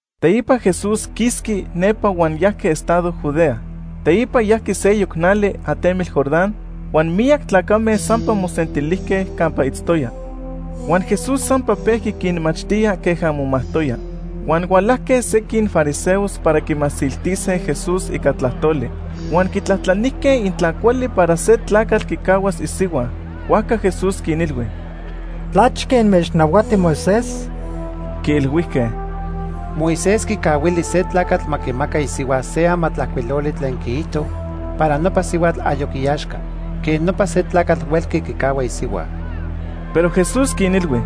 Teipa Jesús quisqui nepa huan yajqui estado Judea. Teipa yajqui seyoc nali atemitl Jordán, huan miyac tlacame sampa mosentilijque campa itztoya. Huan Jesús sampa pejqui quinmachtía queja momajtoya. Huan hualajque sequin fariseos para quimasiltise Jesús ica tlajtoli. Huan quitlajtlanijque intla cuali para se tlacatl quicahuas isihua. Huajca Jesús quinilhui: ―¿Tlachque inmechnahuati Moisés? Quiilhuijque: ―Moisés quicahuili se tlacatl ma quimaca isihua se amatlajcuiloli tlen quiijto para nopa sihuatl ayoc iaxca. Quej nopa se tlacatl huelqui quicahua isihua. Pero Jesús quinilhui: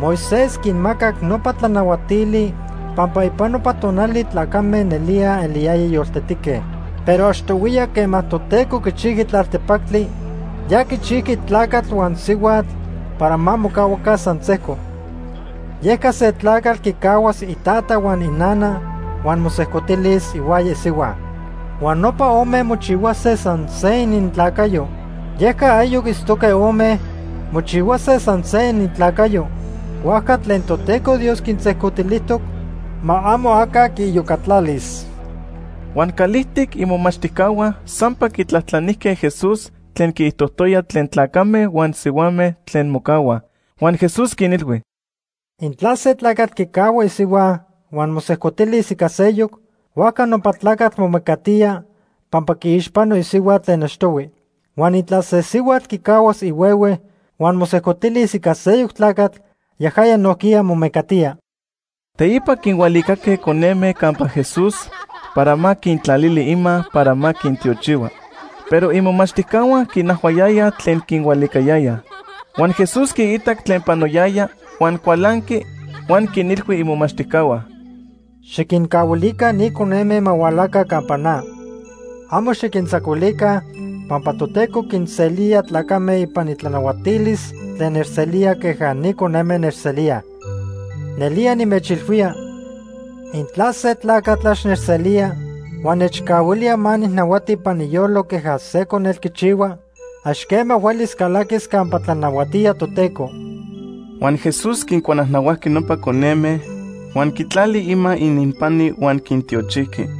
―Moisés quinmacac nopa tlanahuatili pampa ipan nopa tonali tlacame nelía eliyayaj yoltetique, pero achtohuiya quema Toteco quichijqui tlaltepactli, ya quichijqui ‘tlacatl huan sihuatl para ma mocahuaca san sejco.’ Yeca se tlacatl quicahuas itata huan inana huan mosejcotilis ihuaya isihua. Huan nopa ome mochihuase san se inintlacayo. Yeca ayoc itztoque ome, mochihuase san se inintlacayo. Huajca tlen Toteco Dios quinsejcotilijtoc, ma amo aca quiiyocatlalis. Huan calijtic imomachtijcahua sampa quitlajtlanijque Jesús tlen quiijtojtoya tlen tlacame huan sihuame tlen mocahuaj. Huan Jesús quinilhui: ―Intla se tlacatl quicahua isihua huan mosejcotilis ica seyoc, huajca nopa tlacatl momecatía pampa quiixpano isihua tlen achtohui. Huan intla se sihuatl quicahuas ihuehue huan mosejcotilis ica seyoc tlacatl, yajaya nojquiya momecatía. Teipa quinhualicaque coneme campa Jesús para ma quintlalili ima para ma quintiochihua, pero imomachtijcahua quinajhuayayaj tlen quinhualicayayaj. Huan Jesús quiitac tlen panoyaya, huan cualanqui huan quinilhui imomachtijcahua: ―Xiquincahuaca ni coneme ma hualaca campa na. Amo xiquintzacuilica pampa Toteco quinselía tlacame ipan itlanahuatilis tlen nechselíaj queja ni coneme nechselíaj. Nelía nimechilhuía, intla se tlacatl ax nechselía huan nechcahuilía ma nijnahuati ipan iyolo queja se conetl quichihua, ax quema huelis calaquis campa tlanahuatía Toteco. Huan Jesús quincuanajnahuajqui nopa coneme, huan quitlali ima ininpani huan quintiochijqui.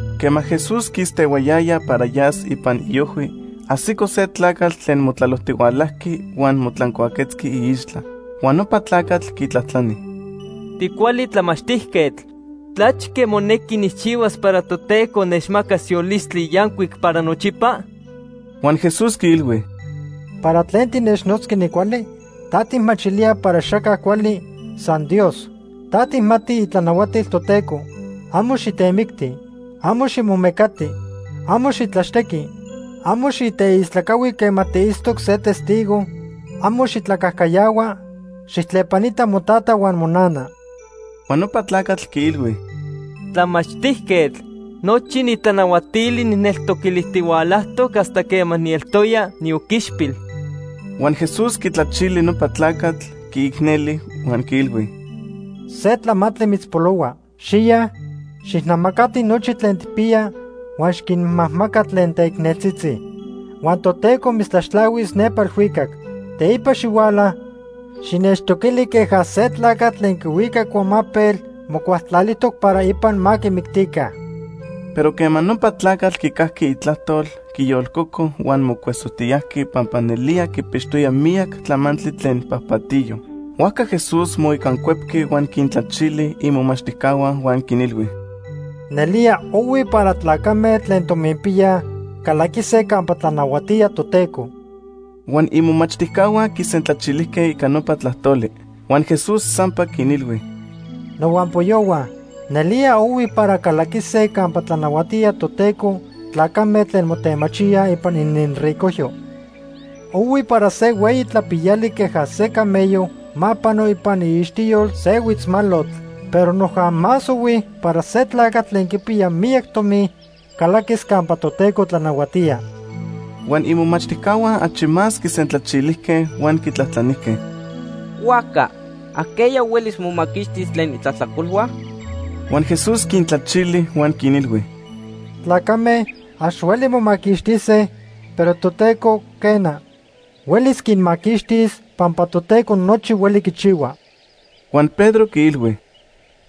Quema Jesús quistehuayaya para yas ipan iojhui, ajsico se tlacatl tlen motlalojtihualajqui huan motlancuaquetzqui iixtla. Huan nopa tlacatl quitlajtlani: ―Ticuali tlamachtijquetl, ¿tlachque monequi nijchihuas para Toteco nechmacas yolistli yancuic para nochipa? Huan Jesús quiilhui: ―¿Para tlen tinechnotzqui nicuali? ¿Ta tijmachilía para axaca cuali, san Dios? Ta tijmati itlanahuatil Toteco: ‘Amo xitemicti; amo ximomecati; amo xitlaxtequi; amo xiteistlacahui quema tiitztoc se testigo; amo xitlacajcayahua; xijtlepanita motata huan monana.’ Huan nopa tlacatl quiilhui: ―Tlamachtijquetl, nochi ni tlanahuatili nijneltoquilijtihualajtoc hasta quema nieltoya nioquichpil. Huan Jesús quitlachili nopa tlacatl, quiicneli huan quiilhui: ―Se tlamantli mitzpolohua. Xiya, xijnamacati nochi tlen tijpiya huan xiquinmajmaca tlen teicneltzitzi. Huan Toteco mitztlaxtlahuis nepa elhuicac. Teipa xihuala, xinechtoquili queja se tlacatl tlen quihuica icuamapel mocualtlalijtoc para ipan ma quimictica. Pero quema nopa tlacatl quicajqui itlajtol, quiyolcoco huan mocuesojtiyajqui pampa nelía quipixtoya miyac tlamantli tlen pajpatiyo. Huajca Jesús moicancuepqui huan quintlachili imomachtijcahua huan quinilhui: ―¡Nelía ohui para tlacame tlen tominpiyaj calaquise campa tlanahuatía Toteco! Huan imomachtijcahua quisentlachilijque ica nopa tlajtoli. Huan Jesús sampa quinilhui: ―Nohuampoyohua, nelía ohui para calaquise campa tlanahuatía Toteco tlacame tlen motemachíaj ipan ininricojyo. Ohui para se hueyi tlapiyali queja se camello ma pano ipan iixtiyol se huitzmalotl, pero noja más ohui para se tlacatl tlen quipiya miyac tomi calaquis campa Toteco tlanahuatía. Huan imomachtijcahua achi más quisentlachilijque huan quitlajtlanijque: ―Huajca ¿ajqueya huelis momaquixtis tlen itlajtlacolhua? Huan Jesús quintlachili huan quinilhui: ―Tlacame ax hueli momaquixtise, pero Toteco, quena, huelis quinmaquixtis pampa Toteco nochi hueli quichihua. Huan Pedro quiilhui: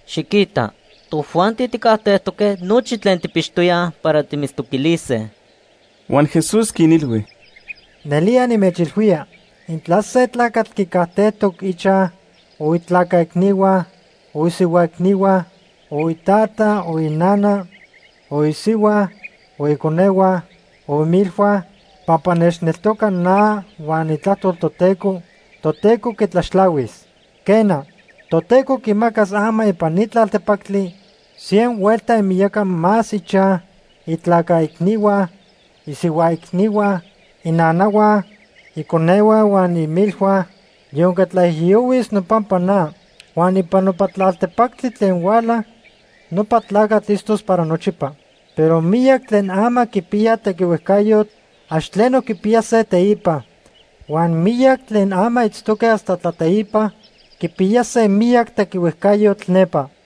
―Xiquita, tojuanti tijcajtejtoque nochi tlen tijpixtoyaj para timitztoquilise. Huan Jesús quinilhui: ―Nelía nimechilhuía, intla se tlacatl quicajtejtoc ichaj, o itlaca icnihua, o isihua icnihua, o itata, o inana, o isihua, o iconehua, o imilhua, pampa nechneltoca na huan itlajtol Toteco, Toteco quitlaxtlahuis. Quena, Toteco quimacas ama ipan ni tlaltepactli cien huelta imiyaca más ichaj, itlaca icnihua, isihua icnihua, inanahua, iconehua huan imilhua, yonque tlaijiyohuis nopampa na. Huan ipan nopa tlaltepactli tlen huala, nopa tlacatl itztos para nochipa. Pero miyac tlen ama quipiyaj tequihuejcayotl, ax tleno quipiyase teipa; huan miyac tlen ama itztoque hasta tlateipa, quipiyase miyac tequihuejcayotl nepa.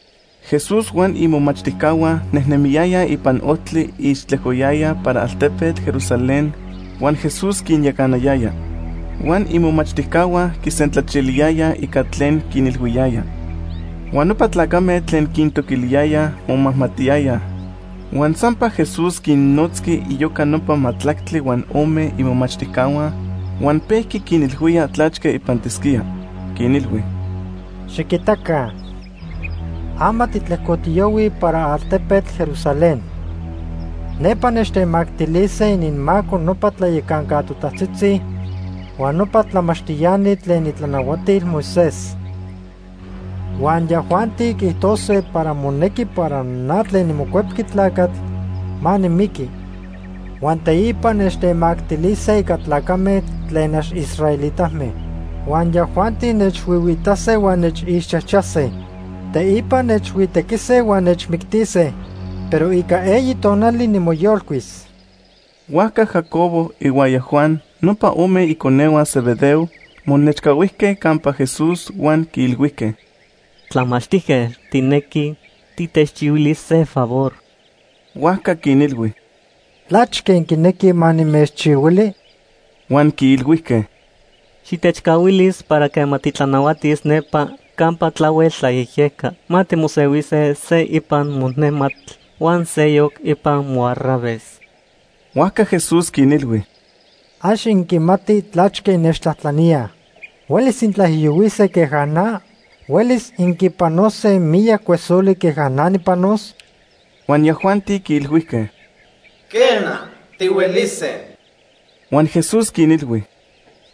Jesús huan imomachtijcahua nejnemiyayaj ipan ojtli ixtlejcoyayaj para altepetl Jerusalén huan Jesús quinyacanayaya. Huan imomachtijcahua quisentlachiliyayaj ica tlen quinilhuiyaya. Huan nopa tlacame tlen quintoquiliyayaj momajmatiyayaj. Huan sampa Jesús quinnotzqui iyoca nopa majtlactli huan ome imomachtijcahua huan pejqui quinilhuía tlachque ipantisquía. Quinilhui: “Xiquitaca, ama titlejcotiyohuij para altepetl Jerusalén. Nepa nechtemactilise ininmaco nopa tlayacanca totajtzitzi huan nopa tlamachtiani tlen itlanahuatil Moisés. Huan yajuanti quiijtose para monequi para na tlen niMocuepqui Tlacatl ma nimiqui, huan teipa nechtemactilise ica tlacame tlen ax israelitame. Huan yajuanti nechhuihuiitase huan nechixchajchase. Teipa nechhuitequise huan nechmictise. Pero ica eyi tonali, nimoyolcuis.” Huajca Jacobo ihuaya Juan, nopa ome iconehua Zebedeo, monechcahuijque campa Jesús huan quiilhuijque: ―Tlamachtijquetl, tijnequij titechchihuilis se favor. Huajca quinilhui: ―¿Tlachque inquinequij ma nimechchihuili? Huan quiilhuijque: ―Xitechcahuilis para quema titlanahuatis nepa campa tlahuel tlayejyejca, ma timosehuise se ipan monejmatl huan seyoc ipan moarraves. Huajca Jesús quinilhui: ―Ax inquimatij tlachque innechtlajtlaníaj. ¿Huelis intlaijiyohuise queja na? ¿Huelis inquipanose miyac cuesoli queja na nijpanos? Huan yajuanti quiilhuijque: ―Quena, tihuelise. Huan Jesús quinilhui: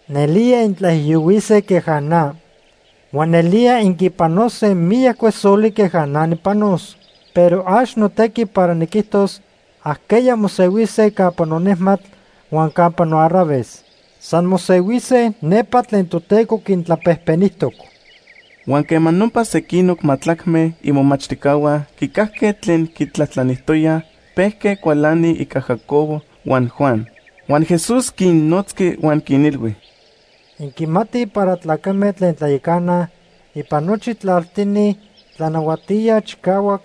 ―Nelía intlaijiyohuise queja na. Huan nelía inquipanose miyac cuesoli queja na nijpanos. Pero ax notequi para niquijtos ajqueya mosehuise campa nonejmatl huan campa noarraves. San mosehuise nepa tlen Toteco quintlapejpenijtoc. Huan quema nopa sequinoc majtlacme imomachtijcahua quicajque tlen quitlajtlanijtoyaj, pejque cualanij ica Jacobo huan Juan. Huan Jesús quinnotzqui huan quinilhui: ―Inquimatij para tlacame tlen tlayacanaj ipan nochi tlaltini tlanahuatíaj chicahuac,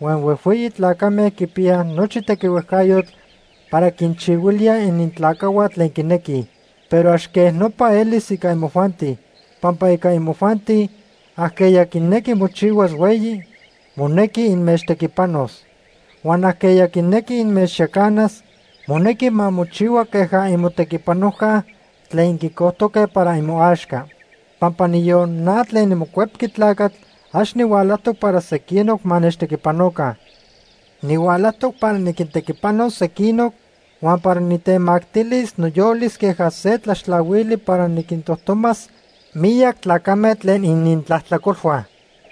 huan huejhueyi tlacame quipiyaj nochi tequihuejcayotl para quinchihuilíaj inintlacajhua tlen quinequij. Pero ax quej nopa elis ica imojuanti. Pampa ica imojuanti, ajqueya quinequi mochihuas hueyi, monequi inmechtequipanos. Huan ajqueya quinequi inmechyacanas, monequi ma mochihua queja imotequipanojca tlen inquicojtoque para imoaxca. Pampa niyon na tlen niMocuepqui Tlacatl, ax nihualajtoc para sequinoc ma nechtequipanoca. Nihualajtoc para niquintequipanos sequinoc, huan para nitemactilis noyolis queja se tlaxtlahuili para niquintojtomas miyac tlacame tlen inintlajtlacolhua.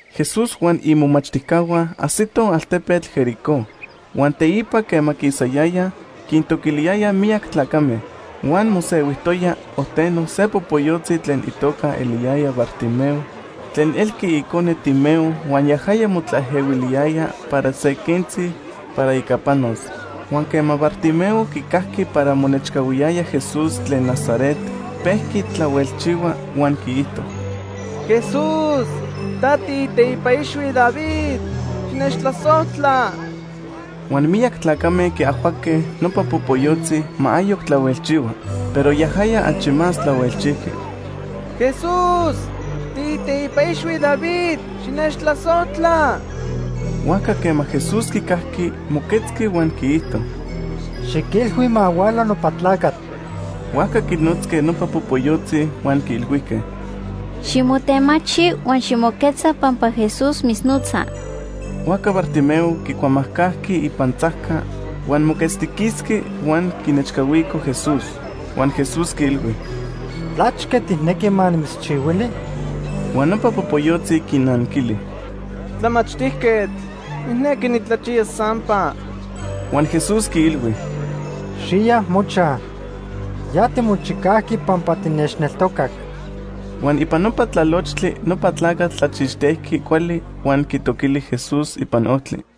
Jesús huan imomachtijcahua ajsitoj altepetl Jericó. Huan teipa quema quisayayaj, quintoquiliyayaj miyac tlacame. Huan mosehuijtoya ojteno se popoyotzi tlen itoca eliyayaj Bartimeo tlen elqui icone Timeo huan yajaya motlaejehuiliyaya para se quentzi para ica panos. Huan quema Bartimeo quicajqui para monechcahuiyaya Jesús tlen Nazaret, pejqui tlahuelchihua huan quiijto: ―¡Jesús, ta tiiteipa ixhui David, xinechtlasojtla! Huan miyac tlacame quiajhuaque nopa popoyotzi ma ayoc tlahuelchihua, pero yajaya achi más tlahuelchijqui: ―¡Jesús, tiiteipa ixhui David, xinechtlasojtla! Huajca quema Jesús quicajqui, moquetzqui huan quiijto: ―Xiquilhui ma huala nopa tlacatl. Huajca quinotzque nopa popoyotzi huan quiilhuijque: ―Ximotemachi huan ximoquetza pampa Jesús mitznotza. Huajca Bartimeo quicuamajcajqui ipantzajca, huan moquetztiquisqui huan quinechcahuico Jesús. Huan Jesús quiilhui: ―¿Tlachque tijnequi ma nimitzchihuili? Huan nopa popoyotzi quinanquili: ―Tlamachtijquetl, nijnequi nitlachiyas sampa. Huan Jesús quiilhui: ―Xiya mochaj. Ya timochicajqui pampa tinechneltocac. Huan ipan nopa tlalochtli nopa tlacatl tlachixtejqui cuali huan quitoquili Jesús ipan ojtli.